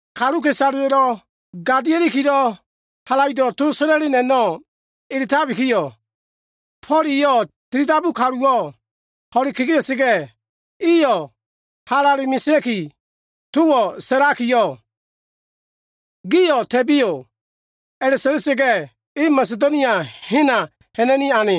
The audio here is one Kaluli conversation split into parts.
Kaluka꞉isaleya꞉lo꞉ gadiakilo꞉ halaido꞉ to sa꞉la꞉leno꞉ edabikiyo꞉, Fo꞉l eyo꞉ tilidabu kaluwo꞉ ho꞉le kegea꞉sa꞉ga꞉yo꞉, iyo꞉ halale mesea꞉ki towo꞉ sa꞉lakiyo꞉ “Gio꞉ ta꞉biyo꞉” a꞉la꞉sa꞉la꞉sa꞉ga꞉, e Masedonia hena ha꞉na꞉ni ane.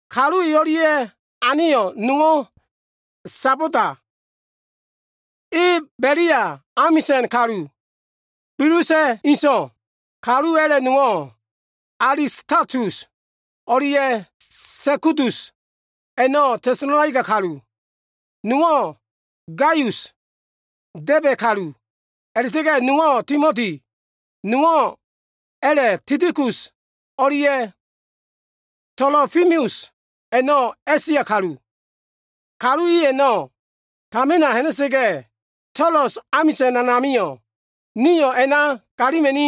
Kalu e o꞉lia꞉lo꞉ aneyo꞉ nowo꞉ Sobata, e Belia amisa꞉n kalu Bilusa꞉ inso꞉. A꞉la꞉ta꞉ga꞉ kalu a꞉la꞉ nowo꞉, Alistakus o꞉lia꞉ Sekudus a꞉no꞉ Tesalonaika kalu. Nowo꞉ Gaius, Debe kalu, a꞉la꞉ta꞉ga꞉ nowo꞉ Timoti. Kalu a꞉la꞉ nowo꞉ Tikikus o꞉lia꞉ Tolofimus a꞉no꞉ A꞉sia kalu. Kalu i a꞉no꞉ tamina ha꞉na꞉sa꞉ga꞉, Toloas amisa꞉n a꞉namio꞉, nio꞉ a꞉na galima꞉ni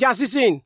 yasisen.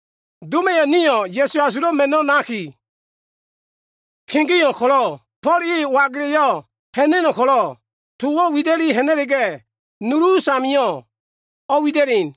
Doma꞉yo꞉ nio꞉ Ya꞉su Asulo꞉ Ma꞉no꞉ naki kegeo꞉ ko꞉lo꞉, Fo꞉l e oagela꞉yo꞉ ha꞉na꞉no꞉ ko꞉lo꞉, towo꞉ wida꞉li ha꞉na꞉la꞉ga꞉, nulu us a꞉namio꞉ o꞉wida꞉len.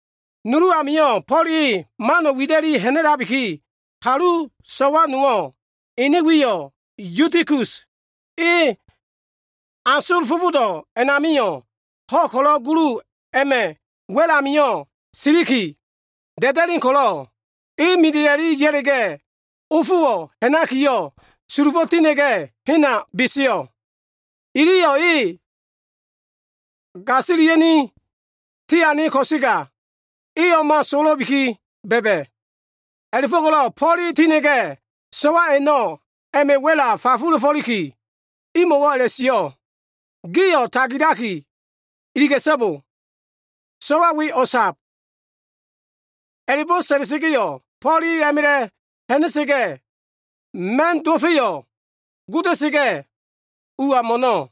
Nulu amio꞉ Fo꞉l e mano꞉ wida꞉li ha꞉na꞉labiki, kalu so꞉wa nowo꞉, ene wiyo꞉ Yutikus, e a asol fofodo꞉ a꞉namio꞉ ho꞉ ko꞉lo꞉ gulu a꞉ma꞉ wa꞉l ami siliki da꞉da꞉len ko꞉lo꞉, e mida꞉i ya꞉la꞉ga꞉ ofowo꞉ ha꞉nakiyo꞉, sulufo꞉ tinda꞉ga꞉, hena beseyo꞉. Iliyo꞉ e gasilia꞉ni tiane ko꞉sega, e o꞉ma sowo꞉lo꞉bi ba꞉ba꞉. A꞉la꞉fo꞉ko꞉lo꞉ Fo꞉l e tina꞉ga꞉, so꞉wa a꞉no꞉ a꞉ma꞉ wa꞉la fafula꞉fo꞉liki, imo꞉wo꞉ a꞉la꞉sio꞉ “Gio꞉ tagilakiyo꞉ iliga꞉so꞉bo! So꞉wa we o꞉sab.” A꞉la꞉bo꞉ sa꞉la꞉sa꞉ga꞉yo꞉, Fo꞉l e a꞉ma꞉la꞉ fa꞉la꞉na꞉sa꞉ga꞉, ma꞉n dowo꞉fa꞉yo꞉ goda꞉sa꞉ga꞉ ua mo꞉no꞉.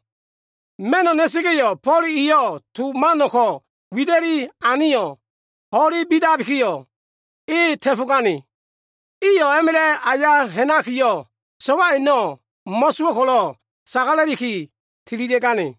Ma꞉no꞉ na꞉sa꞉ga꞉yo꞉, Fo꞉l eyo꞉ to man ko꞉ wida꞉liki aneyo꞉, ho꞉le bidabikiyo꞉, e ta꞉fo꞉gane. Iyo꞉ a꞉ma꞉la꞉ aya ha꞉nakiyo꞉, so꞉wa a꞉no꞉ mo꞉sowo꞉ ko꞉lo꞉ sagala꞉liki tililia꞉gane.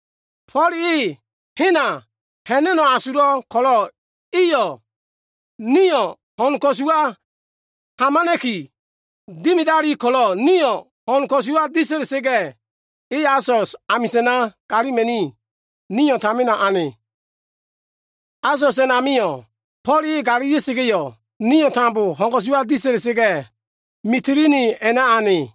Fo꞉l e hena ha꞉na꞉no꞉ asulo꞉ ko꞉lo꞉ eyo꞉ nio꞉ ho꞉n ko꞉suwa hamana꞉ki dimidali ko꞉lo꞉, nio꞉ ho꞉n ko꞉suwa disa꞉la꞉sa꞉ga꞉, e Asos amisa꞉na galima꞉ni, nio꞉ tamina ane. Asos a꞉namio꞉, Fo꞉l e galilia꞉sa꞉ga꞉yo꞉, nio꞉ tambo ho꞉n ko꞉suwa disa꞉la꞉sa꞉ga꞉, Mitilini a꞉na ane.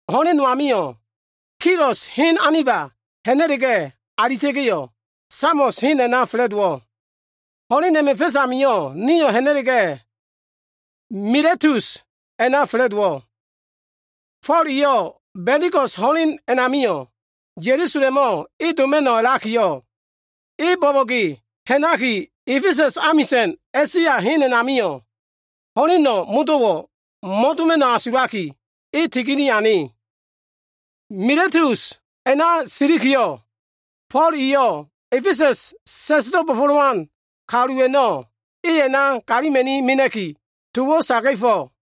Ho꞉len no amio꞉, Kios hen aniba ha꞉na꞉la꞉ga꞉ alita꞉ga꞉yo꞉, Samos hen a꞉na fa꞉la꞉dowo꞉. Ho꞉len a꞉ma꞉ fa꞉s amio꞉, nio꞉ ha꞉na꞉la꞉ga꞉, Miletus a꞉na fa꞉la꞉dowo꞉. Fo꞉l eyo꞉ Ba꞉ndiko꞉s ho꞉len a꞉namio꞉ Ya꞉lusalemo꞉ e doma꞉no꞉ a꞉lakiyo꞉, e bo꞉bo꞉ge ha꞉naki A꞉fesa꞉s amisa꞉n A꞉sia hen a꞉namio꞉, ho꞉leno꞉ modo꞉wo꞉ mo꞉doma꞉no꞉ asulaki, e tigini ane. Miletus a꞉na silikiyo꞉, Fo꞉l eyo꞉ A꞉fesa꞉s sa꞉sdo꞉ bo꞉fo꞉lowan kalu i a꞉no꞉ e a꞉na galima꞉ mena꞉ki, towo꞉ saga꞉fo꞉.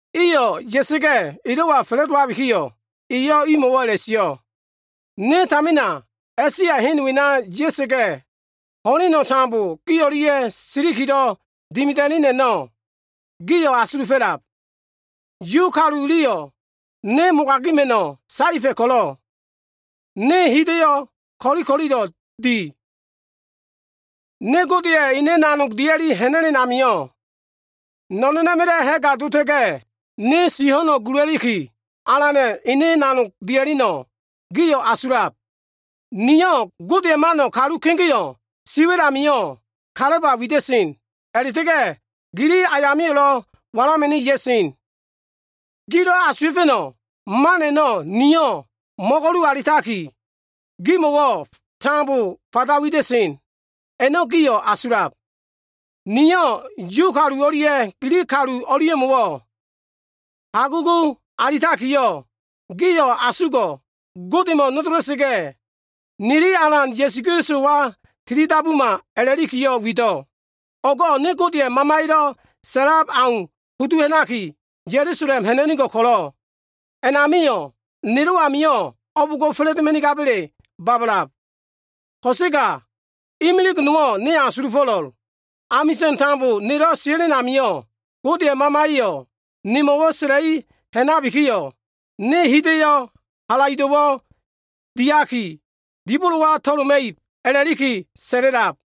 Iyo꞉ ya꞉sa꞉ga꞉ elo꞉wa fa꞉la꞉dowabikiyo꞉, eyo꞉ imo꞉wo꞉ a꞉la꞉sio꞉, “Ne tamina A꞉sia hen wena ya꞉sa꞉ga꞉, ho꞉leno꞉ tambo gi o꞉lia꞉ silikilo꞉ dimida꞉len a꞉no꞉ gio꞉ asulufo꞉lab. Yu kalu iliyo꞉ ne mogagila꞉ma꞉no꞉ saefa꞉ ko꞉lo꞉ ne hida꞉yo꞉ ko꞉li ko꞉lilo꞉ di. Ne Godeya꞉ ene nanog dia꞉li ha꞉na꞉len amio꞉, no꞉no꞉na꞉ma꞉la꞉ ha꞉ga dota꞉ga꞉, ne si ho꞉no꞉ gula꞉liki, Alana꞉ ene nanog dia꞉leno꞉, gio꞉ asulab. Niyo꞉ Godeya꞉ mano꞉ kalu kegeo꞉ siwa꞉l amio꞉ kalaba wida꞉sen. A꞉la꞉ta꞉ga꞉ gili ayamio꞉lo꞉ walama꞉ni ya꞉sen. Gilo꞉ asuwa꞉fa꞉no꞉ man a꞉no꞉ niyo꞉ mo꞉go꞉lu alitakiyo꞉, gimo꞉wo꞉ tambo fanda wida꞉sen, a꞉no꞉ gio꞉ asulab. Niyo꞉ Yu kalu o꞉lia꞉ Gilig kalu o꞉lia꞉mo꞉wo꞉ hagugu alitakiyo꞉, ‘Gio꞉ asugo꞉ Godemo꞉ nodola꞉sa꞉ga꞉, nili Alan Ya꞉suwa tilidabuma’ a꞉la꞉likiyo꞉ wido꞉. “O꞉go꞉ ne Godeya꞉ Mamaya꞉lo꞉ sa꞉lab au kudu ha꞉naki, Ya꞉lusalem ha꞉na꞉nigo꞉l ko꞉lo꞉, a꞉namio꞉ nelo꞉ amio꞉ o꞉bo꞉ngo꞉ fa꞉la꞉doma꞉nigaba꞉le babalab. Ko꞉sega imilig nowo꞉ ne asulufo꞉lo꞉l. Amisa꞉n tambo nelo꞉ sia꞉len amio꞉, Godeya꞉ Mamaya꞉yo꞉ nemo꞉wo꞉ sa꞉la꞉li ha꞉nakiyo꞉, ne hida꞉yo꞉ halaido꞉wo꞉ diaki, dibolowa to꞉loma꞉ib a꞉la꞉liki sa꞉la꞉lab.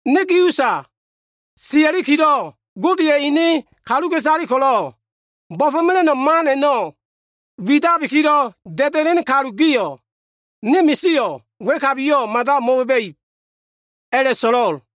“Ne gi usa sia꞉likilo꞉ Godeya꞉ ene kaluka꞉isale ko꞉lo꞉ bo꞉fo꞉mela꞉no꞉ man a꞉no꞉ widabilo꞉ da꞉da꞉len kalu gio꞉, ne misio꞉ wa꞉kabiyo꞉ mada mo꞉ba꞉ba꞉ib, a꞉la꞉asulo꞉l.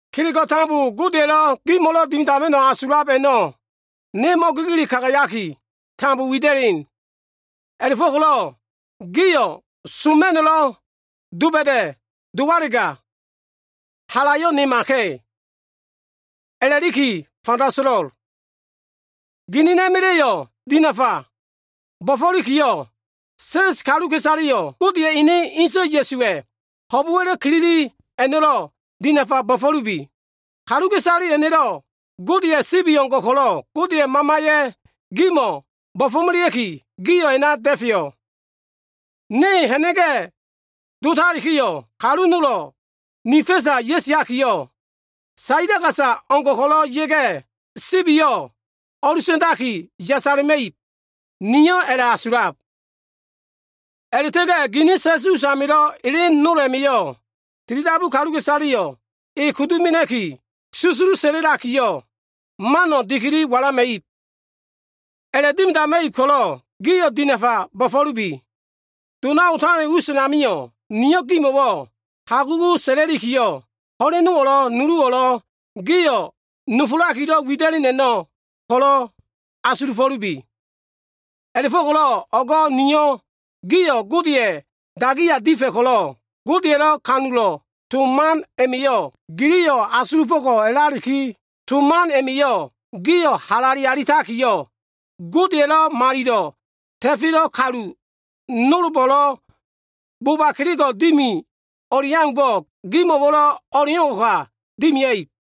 Kelego꞉ tambo Godeya꞉lo꞉ gimo꞉lo꞉ dimidama꞉no꞉ asulab a꞉no꞉, ne mo꞉gigili kagayaki tambo wida꞉len. A꞉la꞉fo꞉ko꞉lo꞉ gio꞉ soma꞉no꞉lo꞉ doba꞉da꞉ dowalega, halayo꞉ nemaka꞉, a꞉la꞉liki fanda so꞉lo꞉l. Ginina꞉ma꞉la꞉yo꞉ dinafa bo꞉fo꞉likiyo꞉, sa꞉s kaluka꞉isaleyo꞉ Godeya꞉ ene inso꞉ Ya꞉suwa꞉ ho꞉bo꞉wa꞉lo꞉ kilili a꞉no꞉lo꞉, dinafa bo꞉fo꞉lubi. Kaluka꞉isale a꞉no꞉, Godeya꞉ sibi o꞉ngo꞉ ko꞉lo꞉, Godeya꞉ Mamaya꞉yo꞉ gimo꞉ bo꞉fo꞉melea꞉ki, gio꞉ a꞉na da꞉feyo꞉. Ne ha꞉na꞉ga꞉ dotalikiyo꞉, kalu nolo꞉ ni fa꞉sa ya꞉siakiyo꞉, saila gasa o꞉ngo꞉ ko꞉lo꞉ ya꞉ga꞉, sibiyo꞉ o꞉lusa꞉ndaki, yasala꞉ma꞉ib, niyo꞉ a꞉la꞉asulab. A꞉la꞉ta꞉ga꞉ gini sa꞉s usamilo꞉ elen nol a꞉ma꞉yo꞉, tilidabu kaluka꞉isaleyo꞉ e kudu mena꞉ki, susulu sa꞉la꞉lakiyo꞉, mano꞉ dikili walama꞉ib. A꞉la꞉dimidama꞉ib ko꞉lo꞉ gio꞉ dinafa bo꞉fo꞉lubi. Dona otalen us a꞉namio꞉, niyo꞉ gimo꞉wo꞉ hagugu sa꞉la꞉likiyo꞉, ho꞉lenowo꞉lo꞉ nuluwo꞉lo꞉ giyo꞉ nofolakilo꞉ wida꞉len a꞉no꞉ ko꞉lo꞉ asulufo꞉lubi. “A꞉la꞉fo꞉ko꞉lo꞉ o꞉go꞉ niyo꞉ gio꞉ Godeya꞉ dagiya difa꞉ ko꞉lo꞉ Godeya꞉lo꞉ ha꞉fo꞉ disa꞉lan to man a꞉no꞉ giliyo꞉ asulufo꞉ko꞉ a꞉lalikiyo꞉, to man a꞉ma꞉yo꞉ gio꞉ halale alitakiyo꞉, Godeya꞉lo꞉ malilo꞉ ta꞉felo꞉ kalu nolbo꞉lo꞉ boba kelego꞉ dimi o꞉li aumbo꞉ gimo꞉wo꞉lo꞉ o꞉leo꞉ngo꞉ ka dimia꞉ib.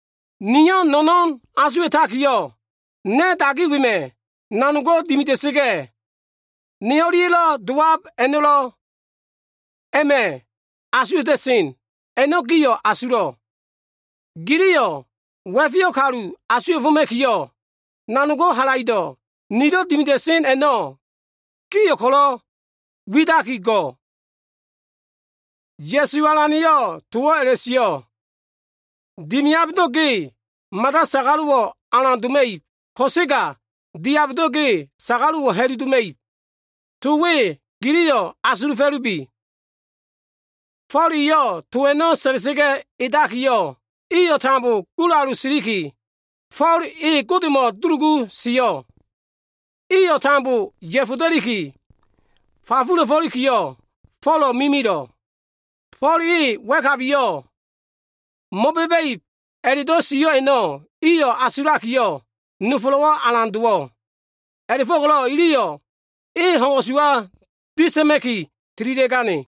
Niyo꞉ no꞉no꞉n asuwa꞉takiyo꞉, na꞉ dagi wema꞉ nanogo꞉ dimida꞉sa꞉ga꞉, ne o꞉lia꞉lo꞉ dowab a꞉no꞉lo꞉ a꞉ma꞉ asuwa꞉ta꞉sen, a꞉no꞉ gio꞉ asulo꞉. Giliyo꞉ wa꞉feyo꞉ kalu asuwa꞉foma꞉kiyo꞉, nanog halaido꞉ nilo꞉ dimida꞉sen a꞉no꞉ gio꞉ ko꞉lo꞉ widakigo꞉l. Ya꞉su Alana꞉yo꞉ towo꞉ a꞉la꞉sio꞉, ‘Dimiabdo꞉ ge mada sagalo꞉wo꞉ alan doma꞉ib ko꞉sega diabdo꞉ ge sagalo꞉wo꞉ ha꞉lu doma꞉ib.’ To we giliyo꞉ asulufo꞉lubi.” Fo꞉l eyo꞉ to a꞉no꞉ sa꞉la꞉sa꞉ga꞉ edakiyo꞉, iyo꞉ tambo gulalu siliki, Fo꞉l e Godemo꞉ dulugu sio꞉. Iyo꞉ tambo ya꞉foda꞉liki fafulakiyo꞉, Fo꞉lo꞉ mimilo꞉. Fo꞉l e wa꞉kabiyo꞉ mo꞉ba꞉ba꞉ib a꞉la꞉do꞉ sio꞉ a꞉no꞉ iyo꞉ asulakiyo꞉, nofolo꞉wo꞉ alan dowo꞉. A꞉la꞉fo꞉ko꞉lo꞉ iliyo꞉ e ho꞉n ko꞉suwa disa꞉ma꞉ki, tililia꞉gane.